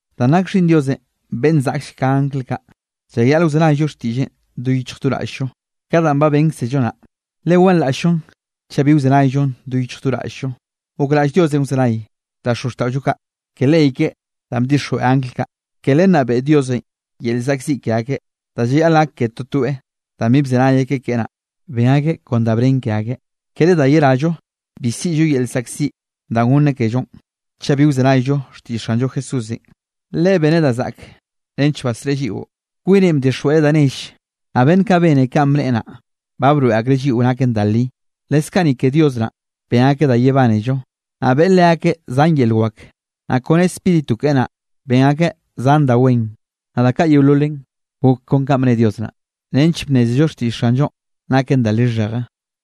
Danꞌ nak Xhiꞌnn Diosenꞌ beꞌnn zaꞌkll ka angl kaꞌ, llayaꞌl wzenayllo xtiꞌlleꞌn do yichj do raꞌll-llo ka danꞌ ba bénkzello naꞌ, le wanraꞌll-llon chaꞌ bi wzenayllon do yichj do raꞌll-llo. Gokraꞌll Diosenꞌ wzenay da xozxtaꞌollo kaꞌ ke ley keꞌe danꞌ bdixjweꞌ angl kaꞌ. Ke len naꞌ beꞌe Diosenꞌ yel llzaꞌkziꞌ ke akeꞌ da llayaꞌl gak ke totoeꞌ, danꞌ bi bzenay akeꞌ keꞌe naꞌ, ben akeꞌ kon da bnen ke akeꞌ. Kere da yerallo, bi siꞌllo yel llzaꞌkziꞌ danꞌ gonneꞌ kellonꞌ, chaꞌ bi wzenayllo xtiꞌll Xanllo Jesúsenꞌ, Leꞌe beneꞌ da zaꞌk nench basreꞌe lliꞌo. Kwineꞌ bdixjweꞌreꞌ da nelle, naꞌ beꞌnn kaꞌ bene kanꞌ bneꞌe naꞌ, ba broeꞌ akreꞌ lliꞌo naken da li. Leskaꞌ ni ke Dios naꞌn ben akeꞌ da yebánello, naꞌ beꞌe leakeꞌ zan yel wak, naꞌ kone Spíritu keꞌe naꞌ, ben akeꞌ zan da wen. Naꞌ da kaꞌ yeololen gok kon kanꞌ bne Dios naꞌ, nench bnnézello xtiꞌll Xanllonꞌ naken da lixheje.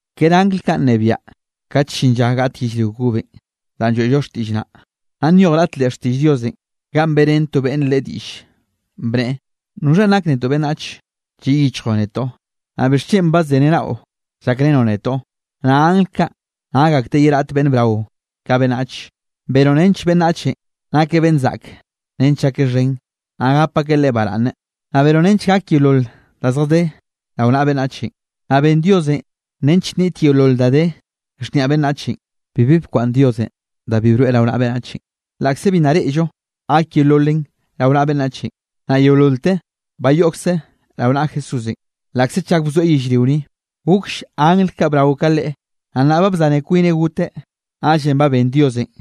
Kere angl kaꞌ nnebiaꞌ kat llin lla gaꞌt yellrio kobenꞌ danꞌ lloeꞌllo xtiꞌll naꞌ. Naꞌ nyoj raꞌt leꞌ xtiꞌll Diosenꞌ ganꞌ beꞌrén to beꞌnne Leꞌe diꞌlle, bneꞌe: ¿Noxha nak netoꞌ beꞌnnachenꞌ, lliꞌ yichjoꞌ netoꞌ? Naꞌ ¿bixchen badzeniaꞌnaꞌo llakrenoꞌ netoꞌ? Naꞌ angl kaꞌ nak akteꞌ ye raꞌt beꞌnn brao ka beꞌnnache. Benoꞌ nench beꞌnnachenꞌ nakeꞌ beꞌnn zaꞌke nench llakeꞌ xhen, naꞌ gap akeꞌ leꞌe baraꞌnne. Naꞌ benoꞌ nench gak yeolol da zjadé rao naꞌa beꞌnnach. Naꞌ ben Diosenꞌ nench niꞌt yeolol da de xhniaꞌ beꞌnnache, bibi bkwaꞌnn Diosenꞌ da bi broeꞌ rao naꞌa beꞌnnache, laꞌkze bi nna reꞌllo gak yeololen rao naꞌa beꞌnnachenꞌ. Naꞌ yeololte ba yoꞌkze rao naꞌa Jesúsenꞌ, laꞌkze chak bzoeꞌ yellrio ni, gokll angl kaꞌ brao ka Leꞌe. Naꞌ nnaꞌ ba bzaneꞌ kwineꞌ goteꞌ, naꞌllenꞌ ba ben Diosenꞌ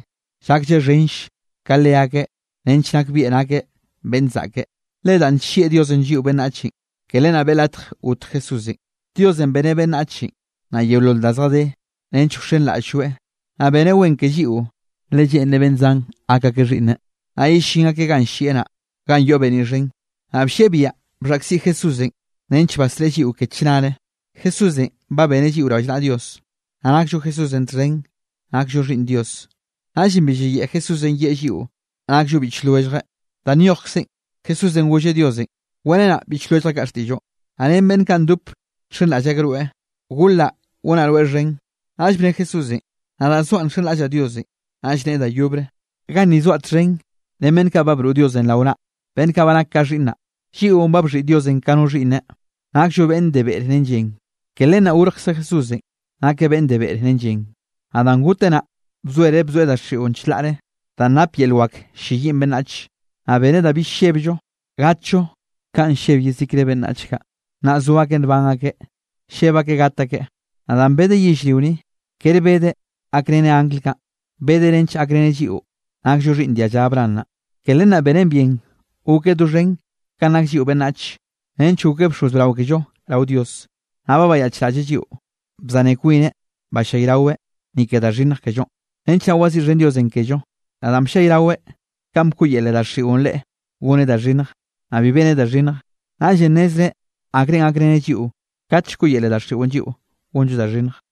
llaklleꞌ xhenll ka leakeꞌ nench nakbieꞌ nakeꞌ beꞌnn zaꞌke. Le danꞌ nllieꞌ Diosenꞌ lliꞌo beꞌnnach, ke len naꞌ beꞌe latj got Jesúsenꞌ. Diosenꞌ beneꞌ beꞌnnache, naꞌ yeolol da zjadé, nench wxenraꞌll-lloeꞌ. Naꞌ beneꞌ wen ke lliꞌo, le lleꞌnreꞌ beꞌnn zan gak akeꞌ xhiꞌnneꞌ, naꞌ yellín akeꞌ ganꞌ llieꞌ naꞌ, ganꞌ yoꞌ beniꞌ xhen, naꞌ bllieꞌ biaꞌa bxhaꞌkziꞌ Jesúsenꞌ nench basreꞌe lliꞌo ke chnare. Jesúsenꞌ ba beneꞌ lliꞌo rallnaꞌa Dios, naꞌ nakllo Jesúsenꞌ txhen nakllo xhiꞌnn Dios. Naꞌllenꞌ bi llayeꞌe Jesúsenꞌ yeꞌe lliꞌo nakllo biꞌch lwelljeꞌ. Da nyojkze, Jesúsenꞌ golleꞌ Diosenꞌ: Weꞌrenaꞌ biꞌch lwelljaꞌ xtiꞌlloꞌ, naꞌ ren beꞌnn kaꞌ ndop nxenraꞌll akeꞌ rweꞌ, golaꞌ gonaꞌ rweꞌ xhen. Naꞌll bne Jesúsenꞌ: Nadaꞌ zoaꞌ nxenraꞌll-llaꞌ Diosenꞌ. Naꞌll neꞌe da yobre: Ganni zoaꞌ txhen ren beꞌnn kaꞌ broꞌ Diosenꞌ rao naꞌ, beꞌnn kaꞌ ba nake ka xhiꞌnnaꞌ. Lliꞌon ba bxhiꞌi Diosenꞌ ka no xhiꞌnneꞌ, nakllo beꞌnn de beꞌre ren llen, ke len naꞌ gorjkze Jesúsenꞌ, nakeꞌ beꞌnn de beꞌre ren llen. Naꞌ danꞌ goteꞌ naꞌn bzoereꞌ bzoeꞌ daxiꞌon chlaꞌre danꞌ nap yel wakenꞌ ll-lleyiꞌn beꞌnnachenꞌ. Naꞌ beneꞌ da bill llebllo gatllo kanꞌ lleb yezikre beꞌnnach kaꞌ, nna zo akeꞌ nban akeꞌ, lleb akeꞌ gat akeꞌ. Naꞌ danꞌ bedeꞌ yellrio ni, kere bedeꞌ gakreneꞌ angl kaꞌn, bedeꞌ nench gakreneꞌ lliꞌo nakllo xhiꞌnn dialla Abraham naꞌ. Ke len naꞌ benen bien gokeꞌ doxhen kanꞌ nak lliꞌo beꞌnnach, nench gokeꞌ bxoz brao kello rao Dios, naꞌ bayaꞌchraꞌlleꞌ lliꞌo. Bzane kwineꞌ ballayraweꞌ, ni ke da xhinnj kellonꞌ, nench naꞌ waziꞌxhen Diosenꞌ kello. Naꞌ danꞌ bllayraweꞌ kanꞌ bkoꞌyele daxiꞌon Leꞌe goneꞌ da xhinnj, naꞌ bi beneꞌ da xhinnj, naꞌllenꞌ nnezreꞌ akrenꞌ gakreneꞌ lliꞌo kat llkoꞌyele daxiꞌon lliꞌo gonllo da xhinnj.